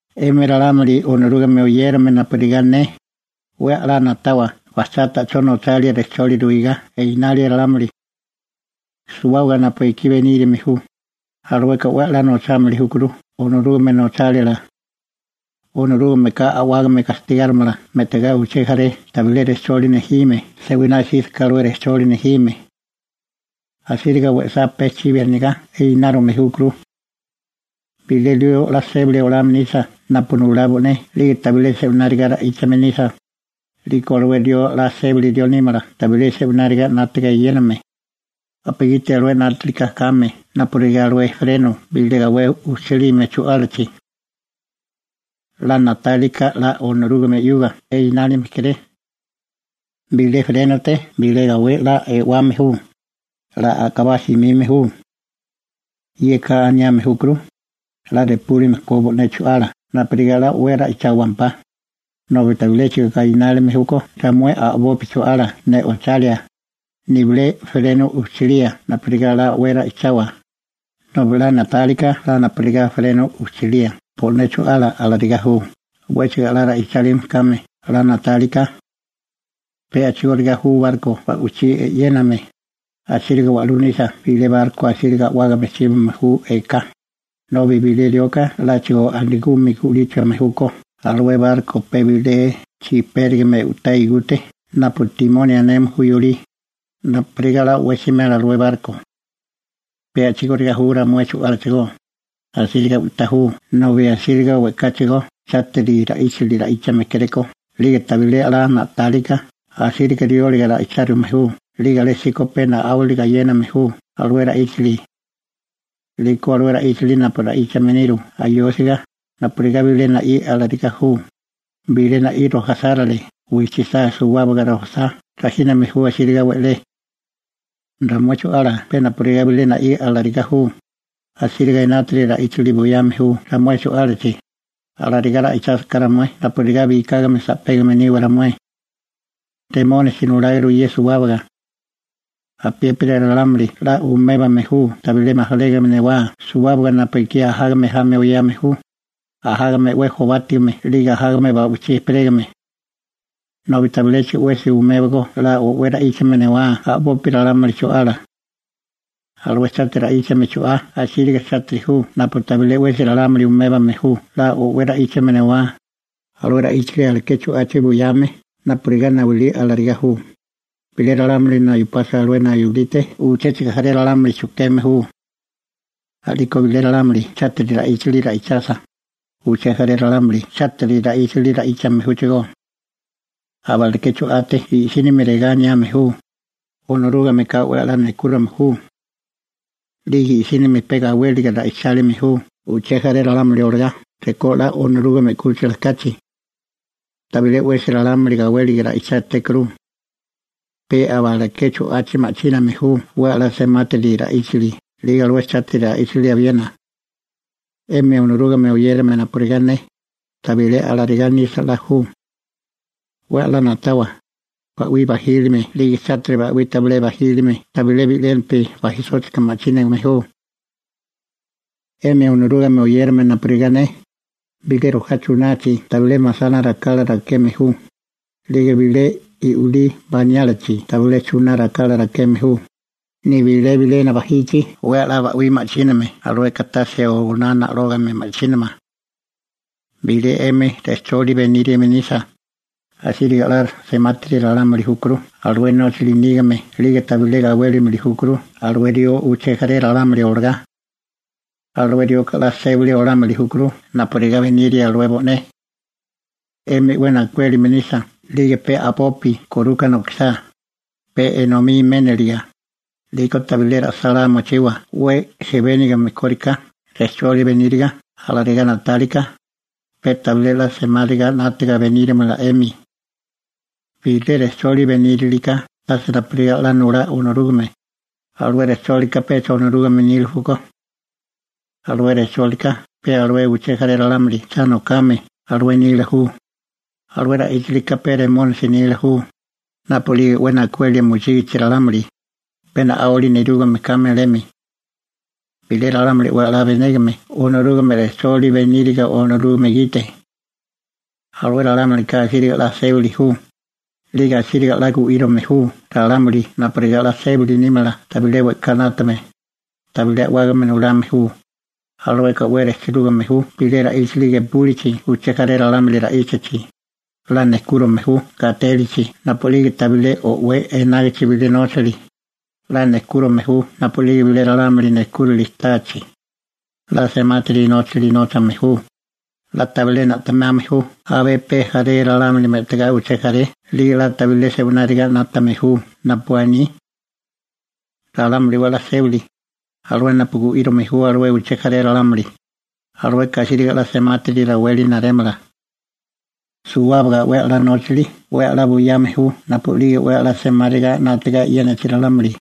'Emi ralámuli Onorúgame oyérame napurigá ne, 'we 'la na'tawa bajchá ta'chó nochalia rejcholi ruigá einalia ralámuli. Suwábaga napu ekí beníriame ju, alueka 'we a'lá nochámili júkuru Onorúgame nochálila. Onorúgameka a'wágame gastigáromala me'tigá uché jaré tabilé rejcholi nejime se'winá 'sísaká alué rejcholi nejime. Asíriga we'sá pe chibi anigá inárume júkuru. Bilé rió 'la sébali olame nisa napu nulá bo'né 'lige tabilé se'wináriga ra'íchame nisa, 'liko alué rió 'la sébali rió nímala tabilé se'wináriga 'nátaga eyéname, napugiti alué 'nátilika kame napurigá alué ‹‹freno›› bilé gawé ujchalime chu'álachi. 'La na'tálika 'la Onorúgame 'yuga inálime kéré. Bilé ‹‹frénote›› bilé gawé 'la e'wame ju, 'la a'kabá simime ju. Yeka aniame júkuru: 'La repúlime ko bo'né chu'ala napurigá 'la o'wé ra'icháwempá, nobi tabiléchigo gainárume júkó ramué 'la a'boi chu'ala ne'ochalia nibilé ‹‹freno›› ujchalía napurigá 'we ra'ichawa nobi 'la na'táliká 'la napurigá ‹‹freno›› ujchalía bo'né chu'ala, alarigá ju. 'Wéchigo 'la ra'íchame kame 'la na'táliká. Pe a'chigóriga ju barko ba'wichí e'yéname, asíriga wa'lú nisa bilé barko asíriga a'wágame chíbame ju eká, nobi bilé rioka 'láchigo a'nagumi gu'líchame júkó alué barko pe bilé igú chijpérigamete, napurigá 'la o'wé simela alué barko. Pe a'chigóriga ju ramué chu'álachigó, asíriga u'tá ju nobi asíriga we'káchigo chátiri ra'íchali ra'íchame kéréko 'lige tabilé 'la na'tálika asíriga rióliga ra'ichárume ju 'lige alésíko pe na'áwali gayéname ju alué ra'íchali. 'Liko alué ra'íchali napu ra'íchame niru ayósiga, napurigá bilé na'í alarigá ju, bilé na'í rojasárale wijchisá suwábaga rojasá rajíname ju asíriga we'lé. Ramué chu'ala pe napurigá bilé na'í alarigá ju, asíriga enátiri ra'íchali buyame ju ramué chu'álachi, alarigá ra'ichásiká ramué napurigá bikágame sa'pégame niwa ramué. Remónisi nuláguru ye suwábaga. Apiépiri ralámuli 'la umébame ju tabilé majalégame newá suwábaga napu ekí ajágame jami oyame ju, ajágame 'we jobátigame 'lige ajágame ba'wichí ejperégame. Nobi tabiléchigo 'wesi umébago 'la o'wé ra'íchame newá a'bopi ralámuli chu'ala. Alué chátiri ra'íchame chu'á asíriga chátiri ju napu tabilé 'wesi ralámuli umébame ju 'la o'wé ra'íchame newá, alué ra'íchali aleké chu'achi buyame napurigá nayulí alarigá ju, bilé ralámuli nayupasa alué nayulite uchéchigo jaré ralámuli chujkeme ju. A'liko bilé ralámuli chátiri ra'íchali ra'ichasa, uché jaré ralámuli chátiri ra'íchali ra'íchame júchigó. Abaleké chu'ate i'sínimi regá aniame ju: «Onorúgameka 'we 'la nejkúrame ju.» 'Lige i'sínimi pe gawéliga ra'ichálime ju uché jaré ralámuli olagá rekó 'la Onorúgame 'kúchila kachi. Tabilé 'wesi ralámuli gawéliga ra'ichátékuru. Pe abaleké chu'achi ma'chíname ju 'we 'la semátiri ra'íchali 'lige alué chátiri ra'íchali abiena. 'Emi Onorúgame oyérame napurigá ne, tabilé alarigá nisa 'la ju. 'We 'la na'tawa, ba'wí bajílime 'lige chátiri ba'wí tabilé bajílime tabilé bi'lénapi bajisóchika ma'chínigame ju. 'Emi Onorúgame oyérame napurigá ne, bilé chunachi tabilé masana rakala rakeme ju, 'lige bilé i'wilí baniálichi tabilé chuná rakala rakeme ju, nibilé bilena 'we a'lá bajichi oná na'lógame ba'wí ma'chínamala. Bilé 'emi rejcholi beníriame nisa, asíriga 'la semátiri ralámuli júkuru alué nóchali nígame 'lige tabilé gawélimili júkuru alué rió uché jaré ralámuli olagá. Alué rioka 'la sébali olámili júkuru napurigá beniria alué bo'né. 'Emi 'we najkuélime nisa 'lige pe a'bopi koruka nokisá, pe enomí méniliga, 'liko tabilé ra'sálá mochiwa 'we jebénigame kóriká rejcholi beníriga alarigá na'tálika, pe tabilé 'la semáriga 'nátaga benírimala 'emi. Bilé rejcholi benírilika tase napurigá 'la nulá Onorúgame, alué rejchólika pecha Onorúgame nila júkó. Alué rejchólika pe alué uché jaré ralámuli cha nokame alué nila ju, alué ra'íchalika pe Remónisi nila ju, napu'lige 'we najkuelia mochígichi ralámuli, pe na'áwali nerúgame kame alemi. Bilé ralámuli 'we 'la benégame Onorúgame rejchólila beníriga Onorúgame gite, alué ralámulika asíriga 'la sébali ju, 'lige asíriga la gu'írome ju ralámuli napurigá 'la sébali nímala tabilé we'ká 'nátame, tabilé a'wágame nulame ju, alueka 'we rejchirúgame ju bilé ra'íchali gepúlichi uché jaré ralámuli ra'íchachi, 'la nejkúrome ju gatélichi napu'lige tabilé o'wé enágichi bilé nóchali, 'la nejkúrome ju napu'lige bilé ralámuli nejkúrali táachi, 'la semátiri nóchali nóchame ju, 'la tabilé na'temame ju abé pe jaré ralámuli me'tigá uché jaré 'lige 'la tabilé se'wináriga 'nátame ju napu aní. Ralámuli 'we 'la sébali, alué napu gu'írome ju alué uché jaré ralámuli, alueka asíriga 'la semátiri raweli narémala. Suwábaga 'we 'la nóchali 'we a'lá buyame ju napu'lige 'we 'la semáriga 'nátaga e'yénachi ralámuli.